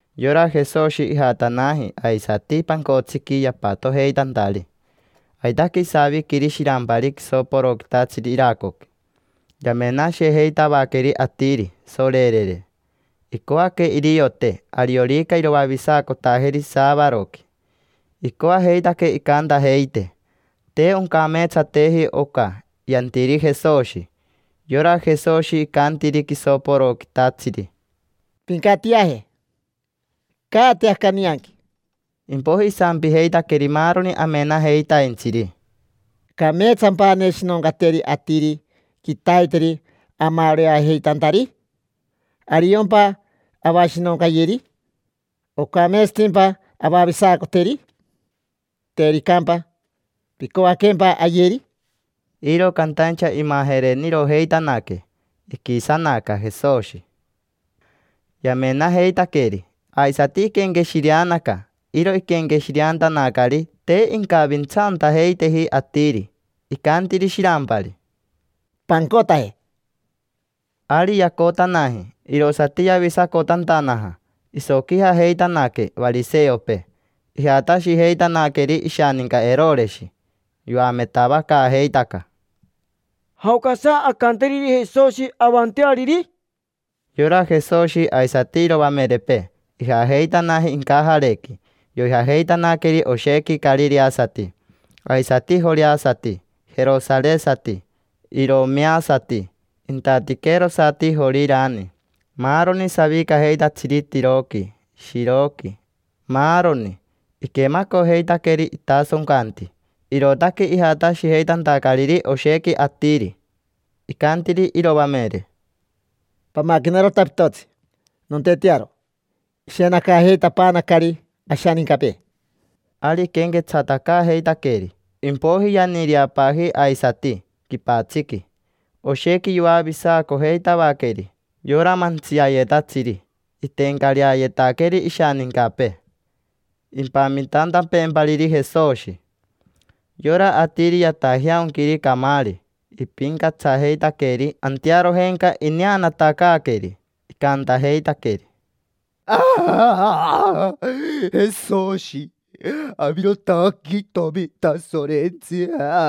Yora Jesoshi ijatanaji aisati pancotsiqui yapatojeitantari. Aitaque isaviquiri shirampari quisoporoquitatsiri iracoqui. Yamenashijeitavaqueri atiri, sorerere: icoaque iriote ariorica iroavisacotajeri saavaroqui. Icoajeitaque incantajeite: “Te oncameetsateji oca yantiri Jesoshi”. Yora Jesoshi icantiri quisoporoquitatsiri: —Pincatiaje, caate aca nianqui. Impoiji isampijeitaqueri maaroni amenajeitaintsiri: —¿Cameetsampa aneshinoncateri atiri quitaiteri amaoreajeitantari? ¿Ariompa avashinoncayeri? ¿Ocameetsatimpa avavisacoteri? Tericampa, ¿picoaquempa ayeri? Iro cantaincha imajerenirojeitanaque. Iquisanaca Jesoshi, yamenajeitaqueri, aisati iquenqueshireanaca. Iro iquenqueshireantanacari te incavintsaantajeiteji atiri. Icantiri shirampari: —Pancotaje. Ari yacotanaji, irosati yavisacotantanaja. Isoquijajeitanaque variseopee, ijatashijeitanaqueri ishaninca Eroreshi. Yoametavacaajeitaca: —¿Jaocasa ancanteriri Jesoshi, avanteariri? Yora Jesoshi aisati iroamerepee ijajeitanaji incajarequi, yoijajeitanaqueri oshequi carireasati, aisati joreasati, jerosaresati, iromeasati, intatiquerosati Jorirani, maaroni savicajeitatsiri Tiroqui, Shiroqui, maaroni. Iquemacojeitaqueri itasoncanti, irootaque ijatashijeitantacariri oshequi atiri. Icantiri iroamere: —Pamaquenarota pitotsi, nontetearo: ishenacajeitapaanacari ashanincapee. Ari iquenquetsatacaajeitaqueri, impoiji yaniireapaaji aisati quipatsiqui. Oshequi yoavisacojeitavaqueri. Yora mantsiayetatsiri iteencareayetaqueri ishanincapee, impamitantapeempariri Jesoshi. Yora atiri yatajeaonquiri camaari ipincatsajeitaqueri. Antearojenca ineanatacaaqueri icantajeitaqueri: —Jesoshi, avirotaque itomi Tasorentsi.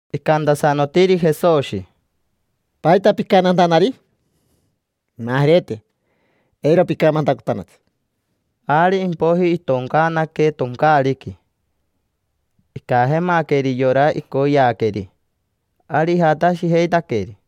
Icantasanotiri Jesoshi: —¿Paita picantantanari? Pimajerete, eiro picamantacotanatsi. Ari impoiji itoncaanaque toncaariqui. Icajemaqueri yora icoyeaqueri, ari ijatashijeitaqueri.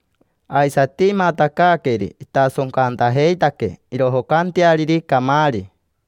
Aisati imatacaaqueri itasoncantajeitaque irojocanteariri camaari.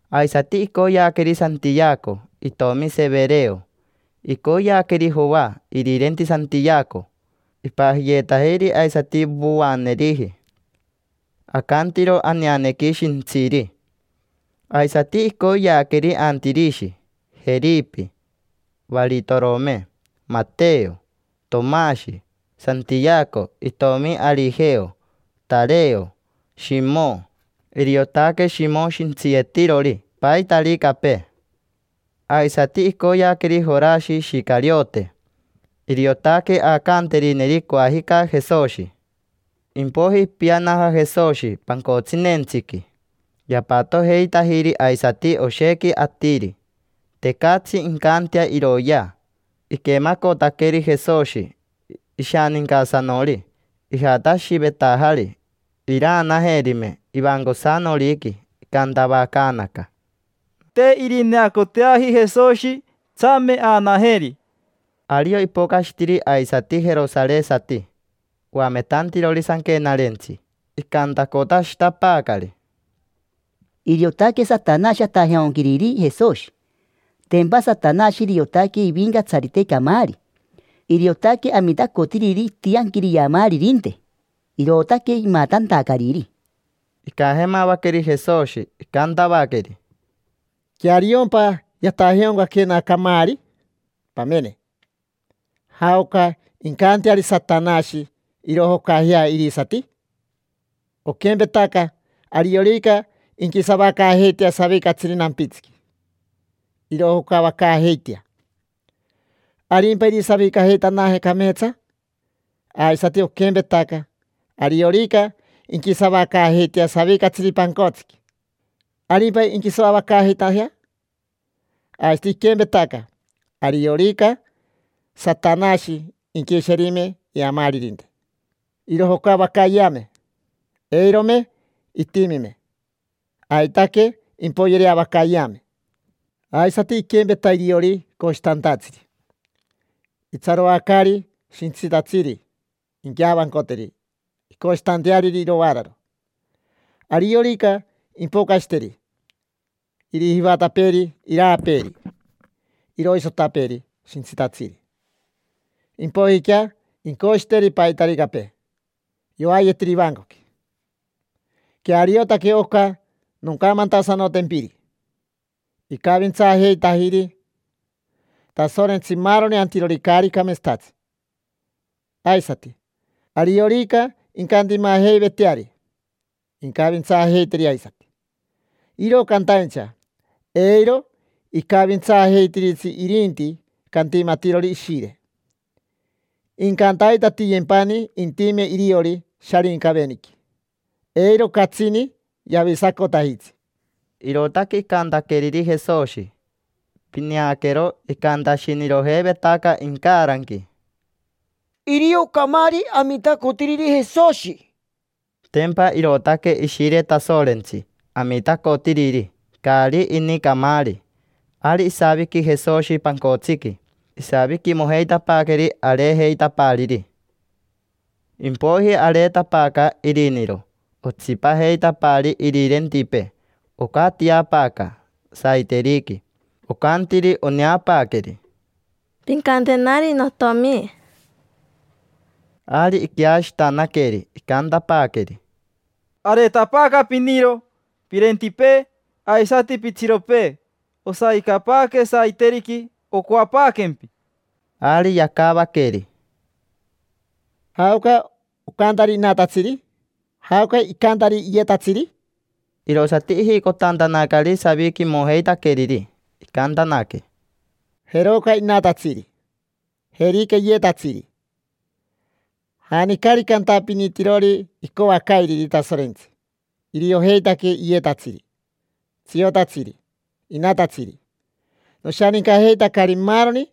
Aisati icoyeaqueri Santiaco itomi Severeo. Icoyeaqueri Joa irirenti Santiaco: ipajiyeetajiri aisati Voaneriji, acantiro aneanequi “Shintsiri”. Aisati icoyeaqueri Antirishi, Jeripi, Varitorome, Mateo, Tomashi, Santiaco itomi Arijeo, Tareo, Shimo. Iriotaque Shimo shintsiyetirori paitaricapee. Aisati icoyeaqueri Jorashi Ishicariote: iriotaque aacanterineri coajica Jesoshi. Impoiji ipianaja Jesoshi pancotsinentsiqui. Yapatojeitajiri aisati oshequi atiri. Tecatsi incantea iroyea. Iquemacotaqueri Jesoshi ishanincasanori, ijatashivetajari iraanajerime ivancosanoriqui. Icantavacaanaca: —Te irineacoteaji Jesoshi, tsame aanajeri. Ario ipocashitiri aisati jerosaresati, oametantirori sanquenarentsi. Icantacotashitapaacari: —Iriotaque Satanashi atajeaonquiriri Jesoshi. Tempa Satanashi iriotaque ivincatsarite camaari: iriotaque amitacotiriri itianquiri iamaaririnte, irootaque imatantacariri. Icajemavaqueri Jesoshi, icantavaqueri: —¿Queariompa yatajeaoncaquena camaari? Pamene: ¿jaoca incanteari Satanashi irojocajea irisati? Oquempetaca ariorica inquisavacaajeitea savicatsiri nampitsiqui, irojocavacaajeitea, ¿arimpa irisavicajeitanaje cameetsa? Aisati oquempetaca ariorica inquisavacaajeitea savicatsiri pancotsiqui, ¿arimpa inquisoavacaajeitajea? Aisati iquempetaca, ariorica Satanashi inquisherime iamaaririnte, irojocavacayeame, eirome itimime: aitaque impoyereavacayeame. Aisati iquempeta iriori coshitantatsiri: itsaroacaari shintsitatsiri inqueavancoteri incoshitanteariri irovaararo. Ariorica impocashiteri, irijivatapeeri iraapeeri, iroisotapeeri shintsitatsiri, impoijiquea incoshiteri paitaricapee yoayetiri ivancoqui. Queariotaque oca noncamantasanotempiri: icavintsaajeitajiri Tasorentsi maaroni antirori caari cameetsatatsi. Aisati, ariorica incantimajeiveteari, incavintsaajeiteri aisati. Iro cantaincha, eiro icavintsaajeitiritsi irinti cantimatirori Ishire: incantaitatiyempani intime iriori Sharincaveniqui. Eiro catsini yavisacotajitsi. Irootaque icantaqueriri Jesoshi. Pineaquero, icantashinirojeivetaca incaranqui: “Irio camaari amitacotiriri Jesoshi”. Tempa irootaque Ishire Tasorentsi amitacotiriri, caari ini camaari. Ari isaviqui Jesoshi pancotsiqui, isaviquimojeitapaaqueri areejeitapaariri. Impoiji areetapaaca iriniro, otsipajeitapaari irirentipee. Ocatiapaaca saiteriqui, ocantiri oneapaaqueri: —Pincantenari notomi. Ari iqueashitanaqueri, icantapaaqueri: —Areetapaaca piniro, pirentipee, aisati pitsiropee. Osavicapaaque saiteriqui, ocoapaaquempi. Ari yacavaqueri: —¿Jaoca ocantari inatatsiri? ¿Jaoca icantari iyetatsiri? Irosati ijicotantanacari saviquimojeitaqueriri. Icantanaque: —Jeroca inatatsiri. Jerica iyetatsiri. Janicarica antapinitirori icoacairiri Tasorentsi: iriojeitaque iyetatsiri, tsiotatsiri, inatatsiri. Noshanincajeitacari maaroni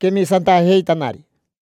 quemisantajeitanari.